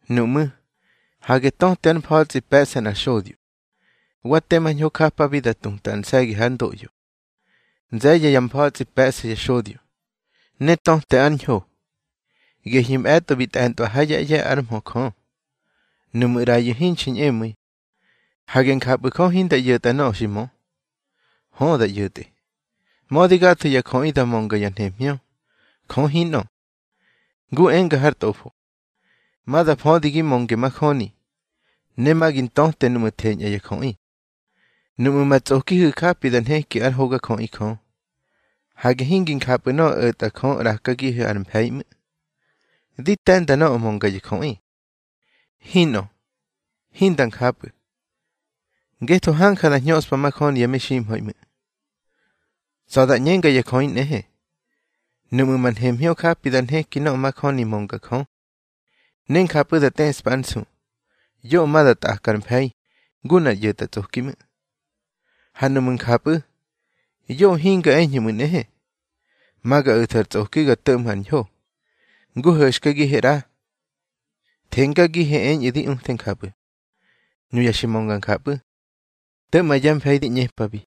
Nuꞌmú̱, hage töte ár mfa̱tsꞌi pe̱ꞌsa nꞌar xodyo. Wa tema ñho japabi da tuta ar nse̱gi hár ndoꞌyo. Nze̱ye̱ ya mfa̱tsꞌi pe̱ꞌsa ya xodyo, ne töte ár hño. Gehyu̱ mꞌe̱tꞌo bi tꞌe̱ntꞌwa ha yá ꞌye̱ ár mhö Jö. Nuꞌmu̱ ꞌrayu̱ hinxi ñꞌemu̱i, hage njapꞌu̱ Jö hinda ꞌyo̱tꞌa nöꞌö xi mö. Hö, da ꞌyo̱tꞌe. Mödi gatho ya jöꞌi da mönga ya nhemhñö, Jö hinꞌö. Ngu enga har tꞌofo: Ma da födi gi mönge majöni, ne ma gi ntöte núꞌmu̱ theñꞌa ya jöꞌi. Nuꞌmu̱ ma tsꞌokihu̱ japi da nheki ár hogajöꞌi Jö, hage hingi njapꞌu̱ nöꞌö o̱tꞌa Jö ꞌrakagihu̱ ar mfe̱i ꞌmu̱. (Di te̱nda nöꞌö mönga ya jöꞌi.) Hinꞌö, hinda njapꞌu̱. Ngetho hanja da hñöꞌspa majöni ya meximha̱i ꞌmu̱. Tsa̱ da ꞌñenga ya jöꞌi nꞌehe, nuꞌmu̱ ma nhemhñö japi da nheki nöꞌö majöni mönga Jö, ne njapꞌu̱ da tꞌeꞌspa ár nsu, yoꞌö ma da tꞌaka ar mfe̱i ngu nꞌar ꞌyo̱tꞌatsꞌoki ꞌmu̱. Ha nuꞌmu̱ njapꞌu̱, yoꞌö hinga eñhu̱ ꞌmu̱ nꞌehe: Ma ga o̱thu̱ ar tsꞌoki ga to̱ꞌmhu̱ ar ñho, ngu ho̱xkagihe ꞌra, thengagihe eñꞌu̱ di uthe njapꞌu̱. Nuya xi mönga njapꞌu̱, to̱ꞌma yá mfe̱i di ꞌñepabi.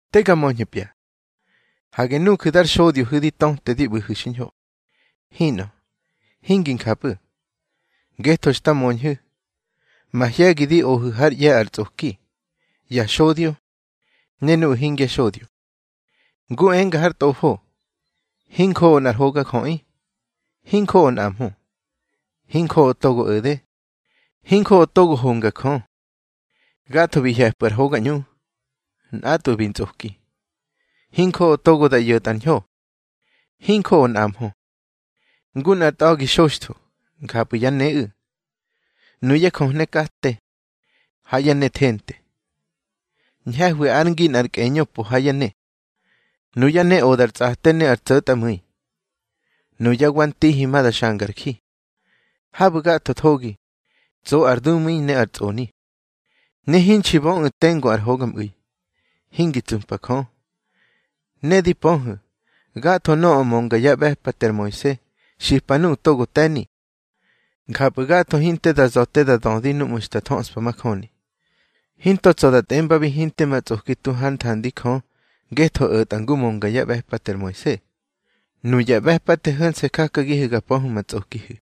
Te ga möñhu̱pya. Hage nuju̱ dar xodyohu̱ di tötehu̱ di ꞌbu̱hu̱ xiñho. Hinꞌö, hingi njapꞌu̱, ngetho xta möñhu̱, mahye̱gi di ohu̱ hár ꞌye̱ ar tsꞌoki, ya xodyo ne nuꞌu̱ hingya xodyo. Ngu enga har tꞌofo: Hinjoꞌo nꞌar hogajöꞌi, hinjoꞌo nꞌamhö. Hinjoꞌo togo o̱de, hinjoꞌo togo honga Jö. Gatho bi hye̱pꞌu̱ ar hoga ꞌñu, nꞌatꞌwu̱ bi ntsꞌoki. Hinjoꞌo togo da ꞌyo̱tꞌa ar ñho, hinjoꞌo nꞌamhö. Ngu nꞌar tꞌa̱gi xoxtho, njapꞌu̱ yá neꞌu̱. Nuyá jöhne kate, ha yá ne thente, ñhe̱hwi ár ngi nꞌar kꞌeñö po ha yá ne. Nuyá ne odar tsꞌate ne ar tso̱tꞌamu̱i. Nuyá wa ntihi ma da xangar ji. Habu̱ gatho thogi, tso ar dumu̱i ne ar tsꞌoni; ne hinxi böꞌu̱ tengu ar hogamꞌu̱i. Hingi tsupa Jö. Ne di pöhu̱, gatho nöꞌö mönga yá ꞌbe̱pate ar Moise, xipa nuꞌu̱ togo te̱ni. Njapꞌu̱ gatho hinte da tsa̱ te da dödi núꞌmu̱ xta thöꞌspa majöni. Hinto tsa̱ da tꞌembabi, hinte ma tsꞌoki tu hár nthandi Jö ngetho o̱tꞌa ngu mönga yá ꞌbe̱pate ar Moise. Nuya ꞌbe̱pate ho̱nse̱ jakagihu̱ ga pöhu̱ ma tsꞌokihu̱.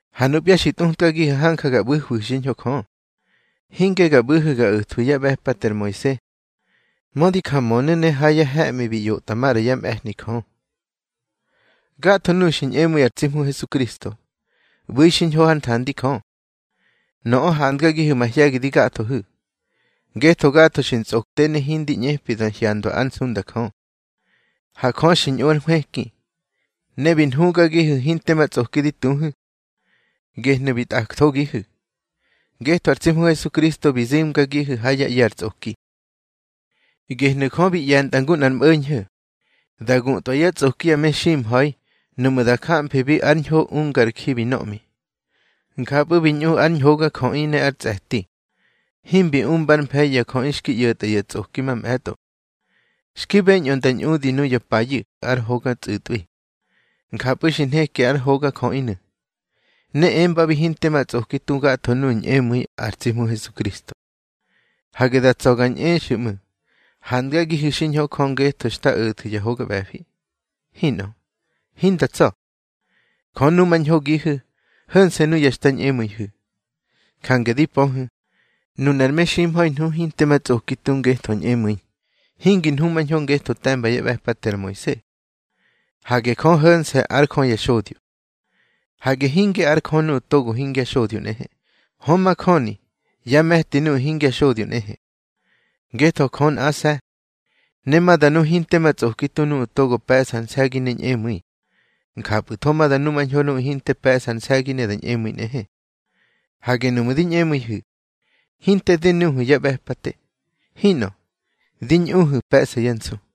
Ha nupya xi tꞌutkagihu̱ hanja ga ꞌbu̱hwihu̱ xiñho Jö. Hinge ga ꞌbu̱hu̱ ga o̱thwu̱ yá ꞌbe̱pate ar Moise, mödi ja mönu̱, ne ha ya he̱ꞌmi bi ꞌyotꞌa maꞌra yá mꞌe̱hni Jö. Gatho nuꞌu̱ xi ñꞌemu̱i ar tsi Hmu Hesukristo, ꞌbu̱i xiñho hár nthandi Jö. Nöꞌö handgagihu̱ mahye̱gi di gathohu̱. Ngetho gatho xi ntsꞌokte ne hindi ꞌñepi da hyandwa ár nsunda Jö. Ha Jö xi ñꞌu ár nhwëki, ne bi nhugagihu̱ hinte ma tsꞌoki di tuhu̱. Gehnu̱ bi tꞌakthogihu̱, ngetho ar tsi Hmu Hesukristo bi zimgagihu̱ ha yá ꞌye̱ ar tsꞌoki. Gehnu̱ Jö bi ꞌye̱ntꞌa ngu nꞌar mꞌo̱ñho̱, da gutꞌwa yá tsꞌoki ya meximha̱i nuꞌmu̱ da jamfibi ár ñho ungár ji bi nöꞌmi. Njapꞌu̱ bi ñꞌu ár ñhogajöꞌi ne ár tsꞌe̱ti, himbi umbár mfe̱i ya jöꞌi xki ꞌyo̱tꞌa ya tsꞌoki mamꞌe̱tꞌo. Xki beñꞌö nda ñꞌudi nuya payu̱ ár hoga tsꞌu̱tꞌwi. Njapꞌu̱ xi nheki ár hogajöꞌinu̱, ne embabi hinte ma tsꞌoki tu gatho nuꞌu̱ ñꞌemu̱i ar tsi Hmu Hesukristo. Hage da tsa̱ ga ñꞌexu̱ ꞌmu̱ handgagihu̱ xiñho Jö ngetho xta o̱thu̱ ya hoga ꞌbe̱fi. Hinꞌö, hinda tsa̱. Jö numañhogihu̱, ho̱nse̱ nuya xta ñꞌemu̱ihu̱. Jange di pöhu̱, nunar meximha̱i nhu hinte ma tsꞌoki tu ngetho ñꞌemu̱i. Hingi nhumañho ngetho te̱mba yá ꞌbe̱pate ar Moise. Hage Jö ho̱nse̱ ár Jö ya xodyo. Hage hinge ár Jö nuꞌu̱ togo hingya xodyo nꞌehe. Hö, majöni yá me̱ti nuꞌu̱ hingya xodyo nꞌehe. Ngetho Jö nꞌase̱, ne ma da nu hinte ma tsꞌoki tu nuꞌu̱ togo pe̱ꞌsa ar nse̱gi ne ñꞌemu̱i. Njapꞌu̱tho ma da numañho nuꞌu̱ hinte pe̱ꞌsa ar nse̱gi ne da ñꞌemu̱i nꞌehe. Hage nuꞌmu̱ di ñꞌemu̱ihu̱, hinte di nuhu̱ ya ꞌbe̱pate. Hinꞌö, di ñꞌuhu̱ pe̱ꞌsa yá nsu.